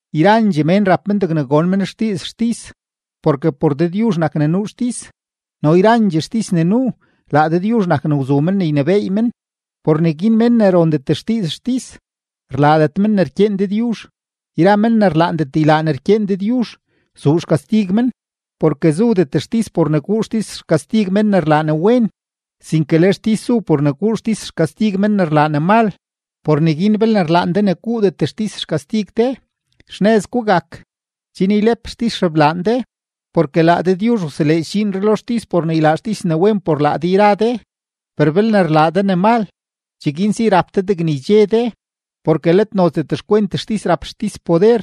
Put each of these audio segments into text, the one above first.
Yrandxee mén rap men degne gon men xdiiz xtis, porke por Dëdyuzh nak ne nuu xtis, no yrandxee xtis ne nuu, laa Dëdyuzh nak ne wzu men ne ynebééy men. Por neguin mén ne rondet xdiiz xtis, rlaadet men ne rkyeen Dëdyuzh; yra men ne rlaandet ylaa ne rkyeen Dëdyuzh, zuu xkastig men. Porke zudet xtis por ne guu xtis xkastig men ne rlaa ne wen, sinke le xtis zu por ne guu xtis xkastig men ne rlaa ne mal. Por neguin belne rlaan de ne guudet xtis xkastig de, xnëz gugak, chen ylep xtis xeblaan de. Porke laa Dëdyuzh wseleedx dxiinree lo xtis por ne ylaa xtis ne wen por laa de yra de. Per belne rlaa de ne mal, cheguin si rap de degne ydxe de; porke let nozdet xkwent xtis rap xtis poder,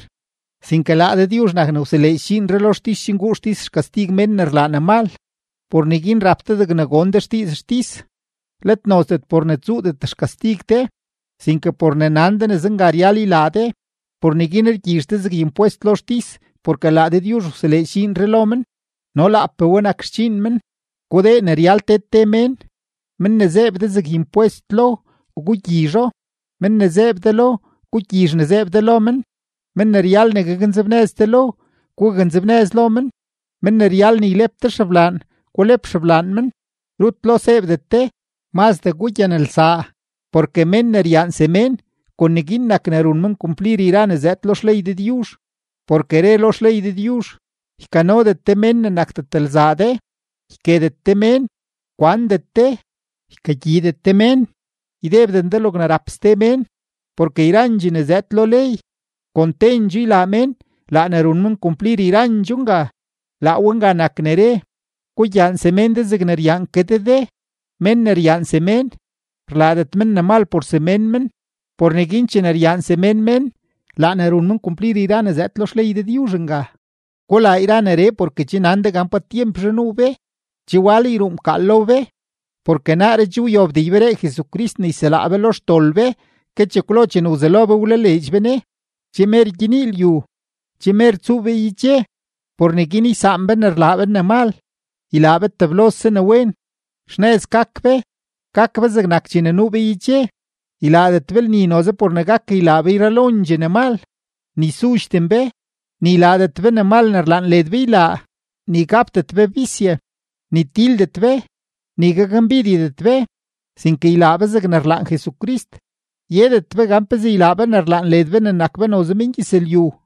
sinke laa Dëdyuzh nak ne wseleedx dxiinree lo xtis chen guu xtis xkastig mén ne rlaa ne mal. Por neguin rap de degne gon de xdiiz xtis, let nozdet por ne tsuudet xkastig de, sinke por ne nan de ne zenga ryal ylaa de. Por neguin rgyizh de zeg impwest lo xtis porke laa Dëdyuzh wseleedx dxiinree lo men, no laapee we nak xdxiin men. Gudee ne ryal te te mén: men ne zeeb de zeg impwest lo, gugyizho; men ne zeeb de lo, gugyizh ne zeeb de lo men; men ne ryal ne gaknzebnëz de lo, gugaknzebnëz lo men; men ne ryal ne ylep de xeblaan, gulep xeblaan men. Rut lo seebdet de, mazdee gugyanelsaa; porke mén ne ryaan semén, kon neguin nak ne run men kumplir yra ne zëëd lo xley Dëdyuzh. Porke re lo xley Dëdyuzh: “Ykanodet de mén ne nakdet lzaa de, yketet de mén, kwandet de, ykagyiidet de mén, ydebden de logne rap ste mén.” Porke yrandxee ne zëëd lo ley, kon tendxoo ylaa mén laa ne run men kumplir yrandxoo nga; laa we nga nak ne re: “Gugyaan semén de zegne ryaan ke de de.” Mén ne ryaan semén, rlaadet men ne mal por semén men; por neguin chene ryaan semén mén, laa ne run men kumplir yra ne zëëd lo xley Dëdyuzh nga. Gulaa yra neree porke che nan de gan pa tyempzhe nuu be, che wal yruu mkaal lo be, porke naaree che wyobdee yberee Jesucrist ne yselaa be lo xdol be ke chekwlo chene wzelo be wlaleedx be Ne. Che mer gyenii lyu, che mer tsuu be yedxe; por neguin ysaan be ne rlaa be ne mal, ylaa be teblose ne wen. Xnëz gak be, gak be zegnak chene nuu be yedxe. Ylaadet be lni noze por ne gak ylaa be yralondxee ne mal, ni sudxden be, ni ylaadet be ne mal ne rlaan led be ylaa, ni gapdet be bisye, ni tildet be, ni gakmbidyedet be, sinke ylaa be zegne rlaan Jesucrist, yedet be gan pezee ylaa be ne rlaan led be ne nak be noze mengyëzlyu.